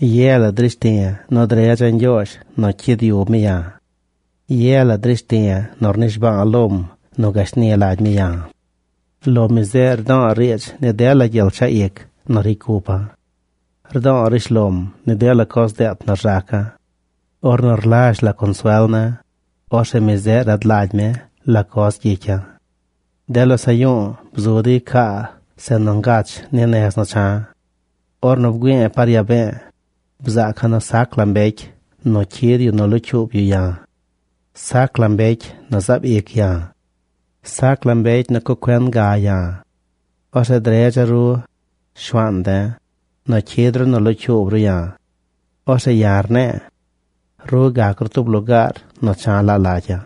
Ye la drishti̱ nu dredza̱ Ñgyoozh nu cyid yub mi ya̱. Ye la drishti̱ nu rnishba̱a̱ lom nu gashni lagy mi ya̱. Lo mi zeꞌ rdo̱o̱ riidz ni dela gyel chaꞌ ic nu ricy cupa̱. Rdo̱o̱ rishlom ni dela coz deet nu rzaca̱. Ornu rlazh la consuel ne̱, orzeꞌ mi zeꞌ rad lagy mi la coz gyicya̱. De losaꞌ yu̱u̱ bzu dey caa zeꞌ nu ngach ni nez nu cha̱. Ornu bgüi̱i̱ par yaa be̱e̱, bzaaca̱ nu sac la mbecy nu cyid yu nu locyuub yu ya̱. Sac la mbecy nu zaab ic ya̱. Sac la mbecy nu cuꞌ cuen ga ya̱. Orzeꞌ dredza̱ ru, Shuaan de̱, nu cyid ru nu locyuub ru ya̱. Orzeꞌ ya̱ rne̱e̱: “Ru gac ru tub lugaar nu cha̱ laa lagya̱.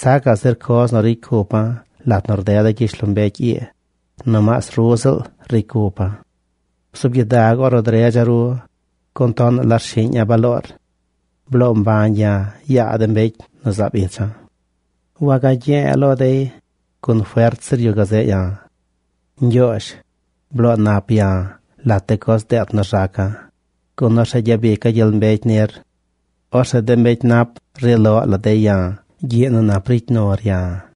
Sacaꞌ zir coz nu ricy cupa̱ lat nu rdeda̱ gyishlombecy ii, nomaas ru ziꞌl ricy cupa̱.” Bzuub gyidag ornu dredza̱ ru, gun tonaꞌ la rshiꞌña̱ baloor. Bloo mbañ ya̱ yaa de mbecy nu zaab icha̱. Wagye̱e̱ lo dey, gun fert zir yu gazeꞌ ya̱. Ñgyoozh, bloo nap ya̱ lat de coz deet nu rzaca̱, gun orzeꞌ gyabica̱ gyel mbecy nir. Orzeꞌ de mbecy nap ri loꞌ la dey ya̱ gyiꞌ nu nap ricy nur ya̱.